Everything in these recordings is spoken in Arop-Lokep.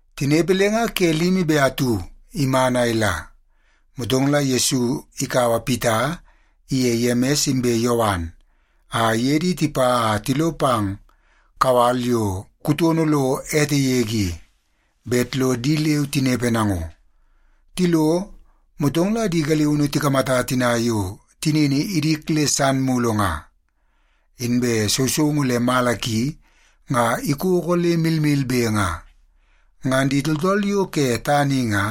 Tinepe le nga ke limi be atu iman a ila, motong la Yesu ikaua Pita iye Yemis inbe Yowan a iye di tipa a tilo pang kawal yo kutono lo ete yege i, bet lo di leu tinepe nango. Tilo, motong la di galiunu tikamata tina yo tinini idik le san mulu nga. Inbe sousoungu le mala ki nga ikoko le milmilbe nga. Ngan di tooltool yo ke tana i nga,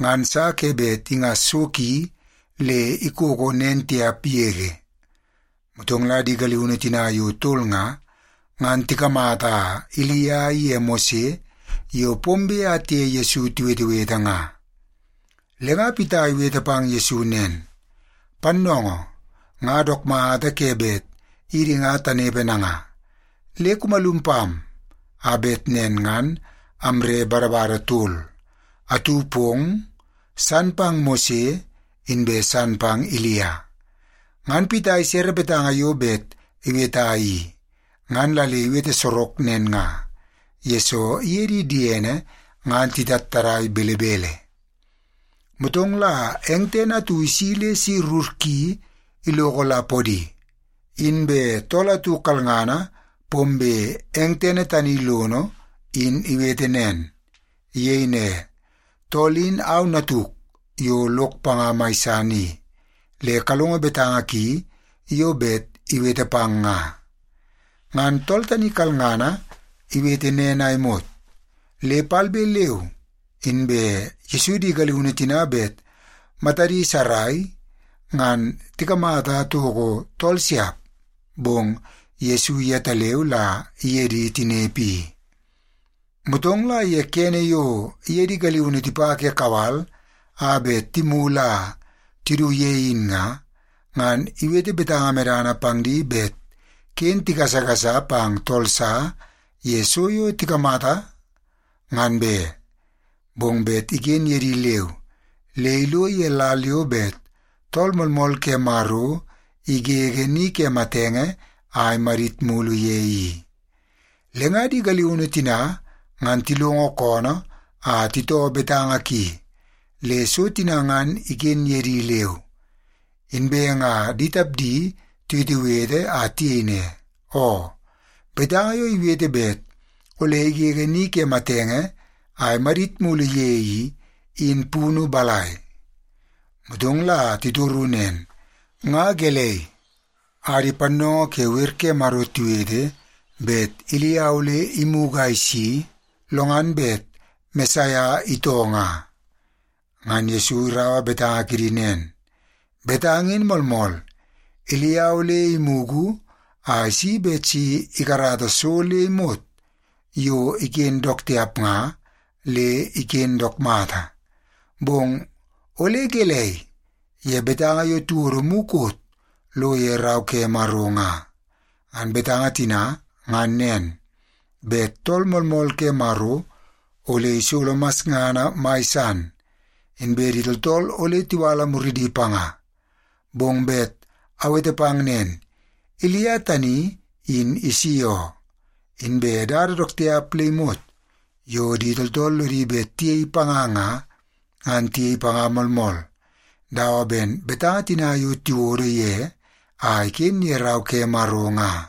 ngan sa ke bet ingas so ki le ikoko nen tiap yege. Motong la di galiunu tina yo tol nga, ngan tikamata Ilia iye Mose yo pombe a tiye Yesu tiwetewete nga. Le nga Pita iwete pang Yesu nen, “Pannoongoo, nga dook mata ke bet idi nga tanepe nanga. Le kumalum pam, a bet nen ngan amre badabada tol; atu pong, san pang Mose, inbe san pang Ilia.” Ngan Pita isere betanga yo bet iweta i, ngan la le iwete sorok nen nga, yesoo iye di diene ngan titattadai belebele. Motong la eng tene atu isi le si rur ki iloko la podi, inbe tool atu kalngana pombe eng tene tani lono in iwete nen. Iyei ne, “Tool in au Natuk yo lok panga mai san i. Le kalongo betanga ki yo bet iwete pang nga!” Ngan tool tani kalangana iwete nen a imot, le palbe leu inbe Yesu di galiunu tina bet matadi sarai, ngan tikamata toko tool siap. Bong Yesu yetaleu la iye di tinepe i. Motong la ye kene yo iye di galiunu tipa ke kawal a bet timulu a tidu ye in nga, ngan iwete betanga medana pang di bet ken tigasagasa pang tool sa ye so yo tikamata, ngan be. Bong bet iken ye di leu le ilo ye lal yo bet Tool Moolmool ke Maro igege ni ke matenge a imadit mulu ye i. Le nga di galiunu tina ngan tilongo koonoo a titoo betanga ki le so tina ngan iken ye di leu. Inbe nga di tapdi tiwetewete a tiyei ne, “Oo, betanga yo iwete bet ole igege ni ke matenge a imadit mulu ye i, in punu balai?” Motong la titoru nen, “Nga gelei a di pannoongoo ke wer ke Maro tiwete bet Ilia ole imugu a isi, lo ngan bet Mesaia itoo nga?” Ngan Yesu iraua betanga kidi nen, “Betanga in moolmool. Ilia ole imugu a isi bet si ikarata so le imot yo iken dook tiap nga, le iken dook mata. Bong ole gelei ye betanga yo tiwodo mukot lo ye Rau ke Maro nga? Ngan betanga tina ngan nen, bet Tool Moolmool ke Maro ole isolo masngana mai san, inbe di tooltool ole tiwala muridi panga. Bong bet awete pang nen, Ilia tani in isi oo. Inbe dada dook tiap le imot yo di tooltool lodi bet tiyei panga nga, ngan tiyei panga moolmool, dawa ben betanga tina yo tiwodo ye a iken ye Rau ke Maro nga.”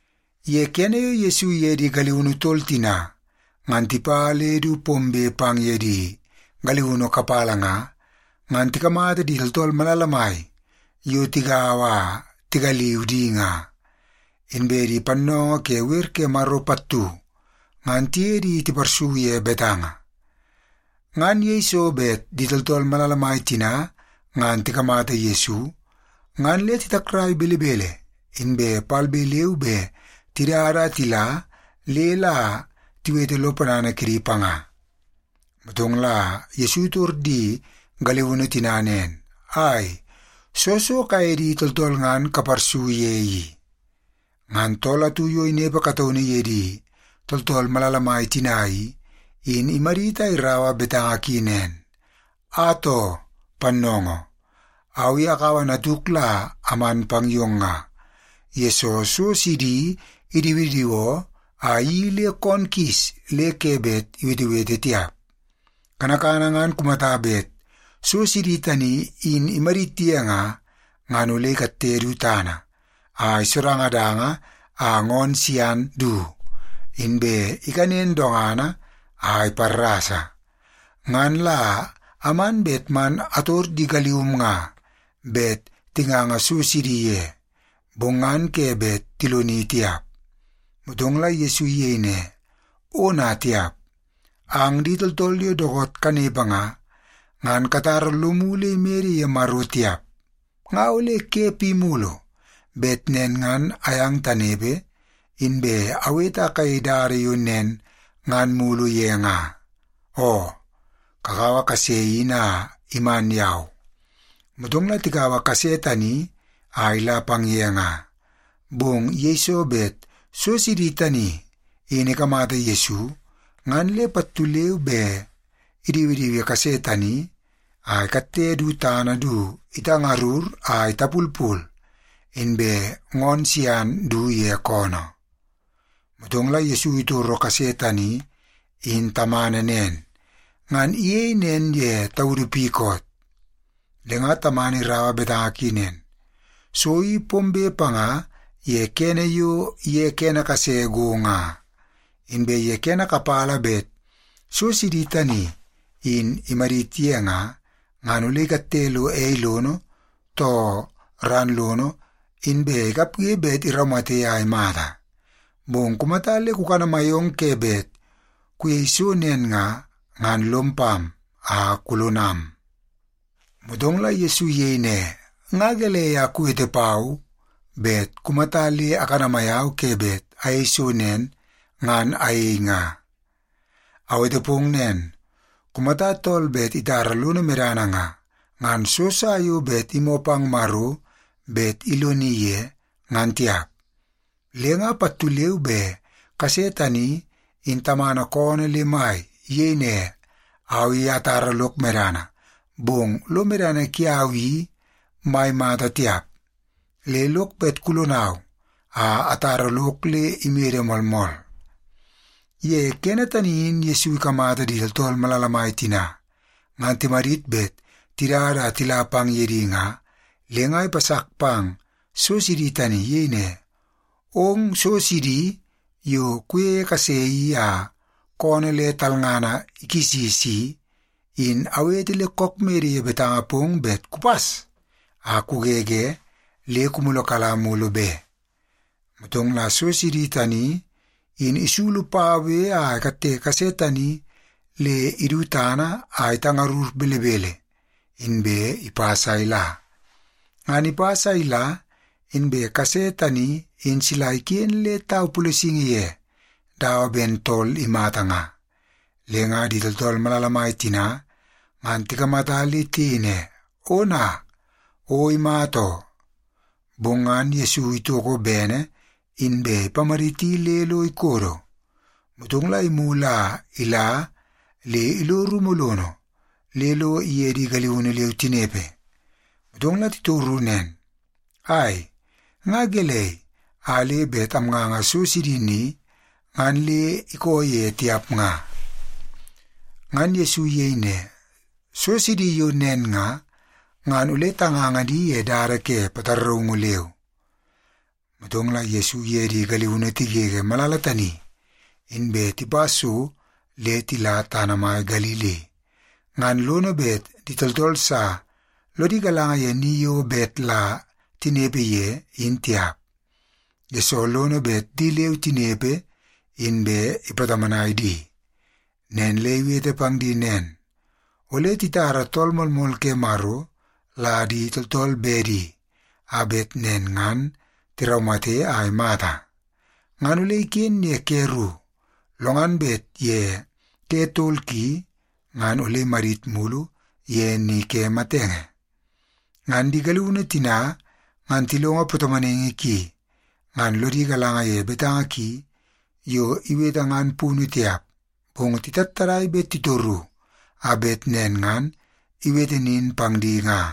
Ye kene yo Yesu iye di galiunu tol tina ngan tipa le du pombe pang ye di galiunu kapala nga, ngan tikamata di tooltool malala mai yo tigaua a tigaliu di nga. Inbe di pannoongoo ke wer ke Maro pattu ngan tiye di tiparsu ye betanga. Ngan yeiso bet di tooltool malala mai tina ngan tikamata Yesu, ngan le titakrai belebele inbe palbe leu be tidada a tila le la tiwete lo ponana kidi panga. Motong la Yesu itor di galiunu tina nen, “Ai, soo so kaye di tooltool ngan kaparsu ye i?” Ngan tool atu yo inepe kataunu ye di tooltool malala mai tina i, in imadit a iraua betanga ki nen, “Atoo, Pannoongoo, au i akaua natuk la aman pang yong nga, yesoo so sidi idiwidiwoo a iyeii le koon kis le ke bet iwetewete tiap. Kanakana ngan kumata bet so sidi tani in imadit ye nga, ngan ole ikatte du tana a isodangadanga a ngoon sian du, inbe ikanen dongana a iparrasa. Ngan la aman bet man ator di galium nga bet tinganga so sidi ye, bong ngan ke bet tiloni tiap.” Motong la Yesu iyei ne, “Ona tiap! Ang di tooltool yo dookoot kanepe nga, ngan katara lomu le imede ye Maro tiap. Nga ole ke pi mulu bet nen ngan ayang tanepe inbe awete a kayei dada yo nen ngan mulu ye nga? Oo, kakaua kase in a iman yau.” Motong la tikaua kase tani a ila pang ye nga. Bong yeiso bet so sidi tani in ikamata Yesu, ngan le pattu leu be idiwidiwi kase tani a ikatte du tana du itangarur a itapulpul, inbe ngoon sian du ye koonoo. Motong la Yesu itoro kase tani in tamana nen, “Ngan iyei nen ye taudu pi koot?” Le nga tamana iraua betanga ki nen, “So i pombe panga ye kene yo ye kene kase go nga. Inbe ye kene kapala bet so sidi tani in imadit ye nga, ngan ole ikatte lo ei lono, too ran lono, inbe ikapge bet iraumate a imata. Bong kumata le kukanamai ong ke bet kuyei so nen nga, ngan lom pam a kulonam.” Motong la Yesu iyei ne, “Nga gelei a kuwete pau, bet kumata le akanamai au ke bet ayei so nen, ngan ayei nga? Awete pong nen, kumata tool bet itara lono medana nga, ngan so sa yo bet imoo pang Maro bet iloni ye, ngan tiap.” Le nga pattu leu be kase tani in tamana koonoo le mai. Iyei ne, “Au i atara lok medana, bong lo medana kiau i mai mata tiap. Le lok bet kulonau a atara lok le imede moolmool.” Ye kene tani in Yesu ikamata di tooltool malala mai tina ngan timadit bet tidada a tila pang ye di nga, le nga ipasak pang so sidi tani. Iyei ne, “Ong so sidi yo kuyeie kase i a koonoo le talngana kisis i, in awete le kook mede ye betanga pong bet kupas a kugege le kumulukala mulu be.” Motong la so sidi tani in isulu paue a ikatte kase tani le idu tana a itangarur belebele, inbe ipas a ila. Ngan ipas a ila inbe kase tani in sila iken le tau pulesingi ye dawa ben tool imata nga. Le nga di tooltool malala mai tina ngan tikamata le tiyei ne, “Ona, o imata oo.” Bong ngan Yesu itoko bene inbe ipamaditi le lo ikodo. Motong la imulu a ila le ilo rumu lono, le lo iye di galiunu leu tinepe. Motong la titoru nen, “Ai, nga gelei a le bet amnganga so sidi ni, ngan le ikoo ye tiap nga?” Ngan Yesu iyei ne, “So sidi yo nen nga, ngan ole tanganga di ye dada ke pataraungu leu.” Motong la Yesu iye di galiunu tigege malala tani, inbe tipa so le tila tana mai Galili. Ngan lono bet di tooltool sa lodi galanga ye ni yo bet la tinepe ye in tiap, yesoo lono bet di leu tinepe inbe ipatomonai di. Nen le iwete pang di nen, “Ole titara Tool Moolmool ke Maro la di tooltool bedi, a bet nen ngan tiraumate a imata. Ngan ole iken ye ke ru, lo ngan bet ye ke tol ki, ngan ole imadit mulu ye ni ke matenge.” Ngan di galiunu tina ngan tilongo patomonaingi ki, ngan lodi galanga ye betanga ki yo iwete ngan punu tiap. Bong titattadai bet titoru, a bet nen ngan iwete nin pang di nga.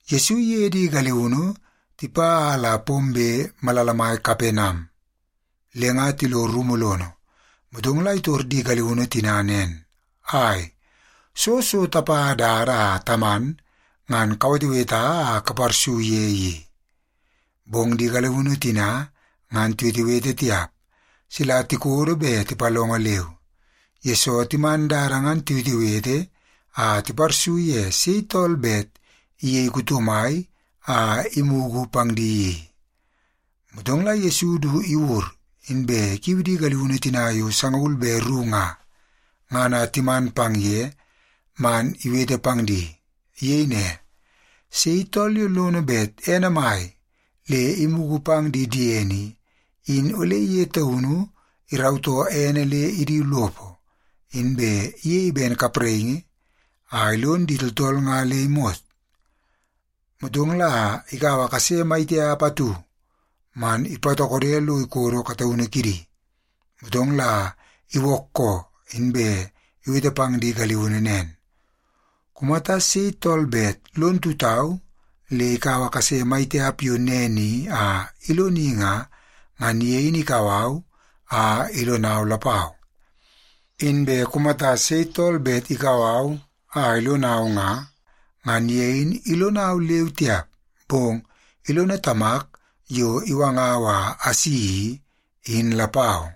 Yesu iye di galiunu tipa a la pombe malala mai Kapenam, le nga tilo rumu lono. Motong la itor di galiunu tina nen, “Ai, soo so tapa dada a taman ngan kaweteweta a kaparsu ye i?” Bong di galiunu tina ngan tiwetewete tiap, sila tikodo be tipalongo leu, yesoo timan dada ngan tiwetewete a tiparsu ye sei tool bet iyei kuto mai a imugu pang di i. Motong la Yesu du iwur, inbe ikiu di galiunu tina yo sangaul be ru nga, ngan a timan pang ye man iwete pang di. Iyei ne, “Sei tool yo lono bet ene mai le imugu pang di diene i, in ole ye taunu irautoo ene le idu lopo, inbe iyei ben kapraingi a ilon di tooltool nga le imot.” Motong la ikaua kase mai tiap atu man ipatokode lo ikodo kataunu kidi. Motong la iwookoo, inbe iwete pang di galiunu nen, “Kumata sei tool bet lon tutau le ikaua kase mai tiap yo nen i a iloni nga, ngan ye in ikau au a ilonau lapau. Inbe kumata sei tool bet ikau au a ilonau nga, ngan ye in ilonau leu tiap, bong ilono Tamak yo iwangau a asi i, in lapau.”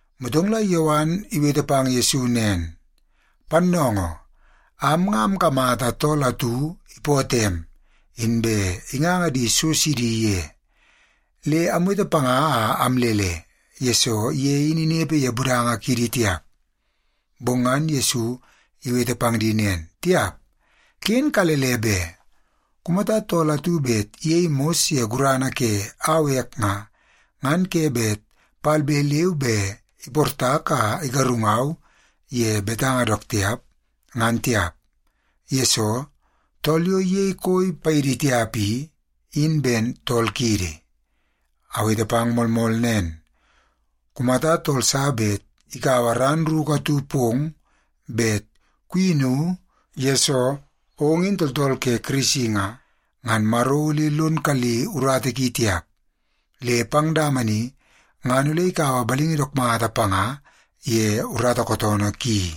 Motong la Yowan iwete pang Yesu nen, “Pannoongoo, am nga amkamata tool atu ipootoo em, inbe inganga di so sidi ye. Le amwete panga a amlele, yesoo ye in inepe ye budanga kiidi tiap.” Bong ngan Yesu iwete pang di nen, “Tiap, ken kalele be! Kumata tool atu bet iyei mos ye gurana ke au ek nga, ngan ke bet palbe leu be iportak a igarungau ye betanga dook tiap, ngan tiap. Yesoo, tool yo iyei koi paidi tiap i, in ben tool kiidi. Awete pang moolmool nen, kumata tool sa bet ikaua ran ruku atu pong bet kuyinu yesoo ong in tooltool ke Kirisi nga, ngan Maro ole lon kali urata ki tiap, le pang dama ni ngan ole ikaua balingi dook mata panga ye urata kootoonoo ki.”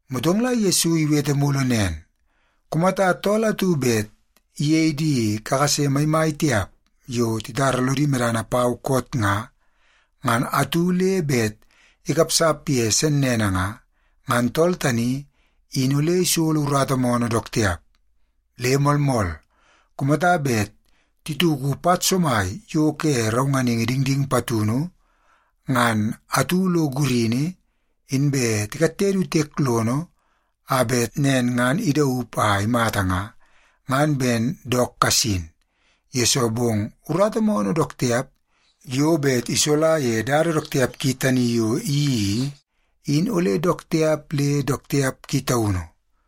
Motong la Yesu iwete mulu nen, “Kumata tool atu bet iyei di kakase maimai tiap yo titara lodi medana pau koot nga, ngan atu le bet ikapsap ye sennene nga, ngan tool tani in ole isolo urata moonoo dook tiap. Le moolmool, kumata bet tituku pat somai yo ke raunganingi dingding patunu ngan atu lo gurini, inbe tikatte du tiek lono a bet nen ngan idaup a imata nga, ngan ben dook kasin, yesoo bong urata moonoo dook tiap yo bet isola ye dada dook tiap ki tani yo iyeii i, in ole dook tiap le dook tiap ki taunu.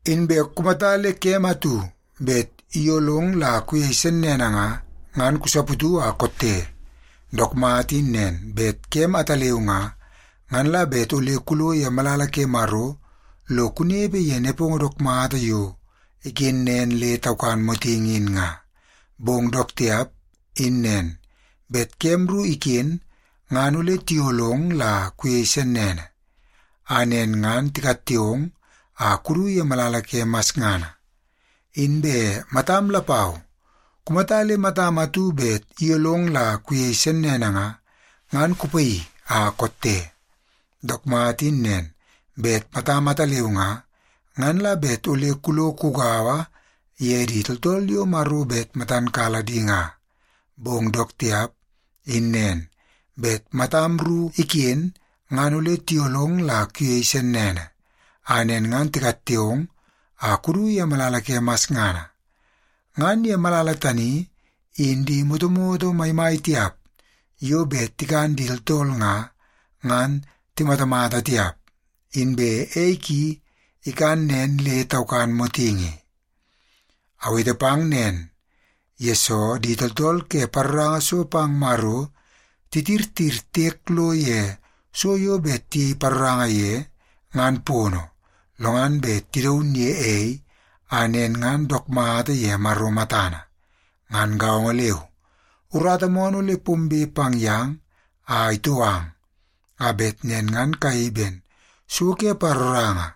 Inbe kumata le kem atu bet iyolong la kuyei sennene nga, ngan kusaputu a kotte. Dook mata in nen, bet kem ataleu nga, ngan la bet ole kulo ye malala ke Maro lo kunepe ye nepongo dook mata yo iken nen le taukan motingi in nga. Bong dook tiap in nen, bet kem ru iken ngan ole tiyolong la kuyei sennene, a nen ngan tikatte ong a kudu ye malala ke masngana. Inbe matam lapau, kumata le matam atu bet iyolong la kuyei sennene nga, ngan kupaii a kotte. Dook mata in nen, bet matam ataleu nga, ngan la bet ole kulo kugaua ye di tooltool yo Maro bet matan kala di nga. Bong dook tiap in nen, bet matam ru iken ngan ole tiyolong la kuyei sennene, a nen ngan tikatte ong a kudu ye malala ke masngana. Ngan ye malala tani, in ‘di motomoto maimai tiap yo bet tikan di tooltool nga, ngan timatamata tiap. Inbe ei ki ikan nen le taukan motingi.’ “Awete pang nen, yesoo di tooltool ke paroranga so pang Maro titirtir tiek lo ye so yo bet tiyei paroranga ye, ngan pono, lo ngan bet tidaun ye ei, a nen ngan dook mata ye Maro matana. Ngan gaongo leu, urata moonoo ole pombe pang yang a itou ang, a bet nen ngan kayei ben so ke paroranga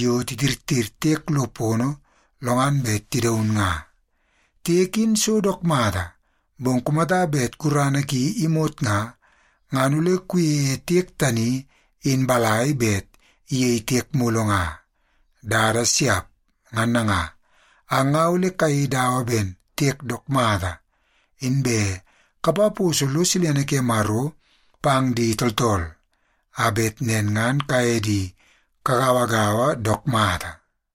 yo titirtir tiek lo pono lo ngan bet tidaun nga. Tiek in so dook mata, bong kumata bet gurana ki imot nga, ngan ole kuyeie tiek tani in balai bet iyei tiek mulu nga? Dada siap! Ngan nanga, ang nga ole kayei dawa ben tiek dook mata, inbe kapaposo lo silene ke Maro pang di tooltool, a bet nen ngan kaye di kagauagaua dook mata.”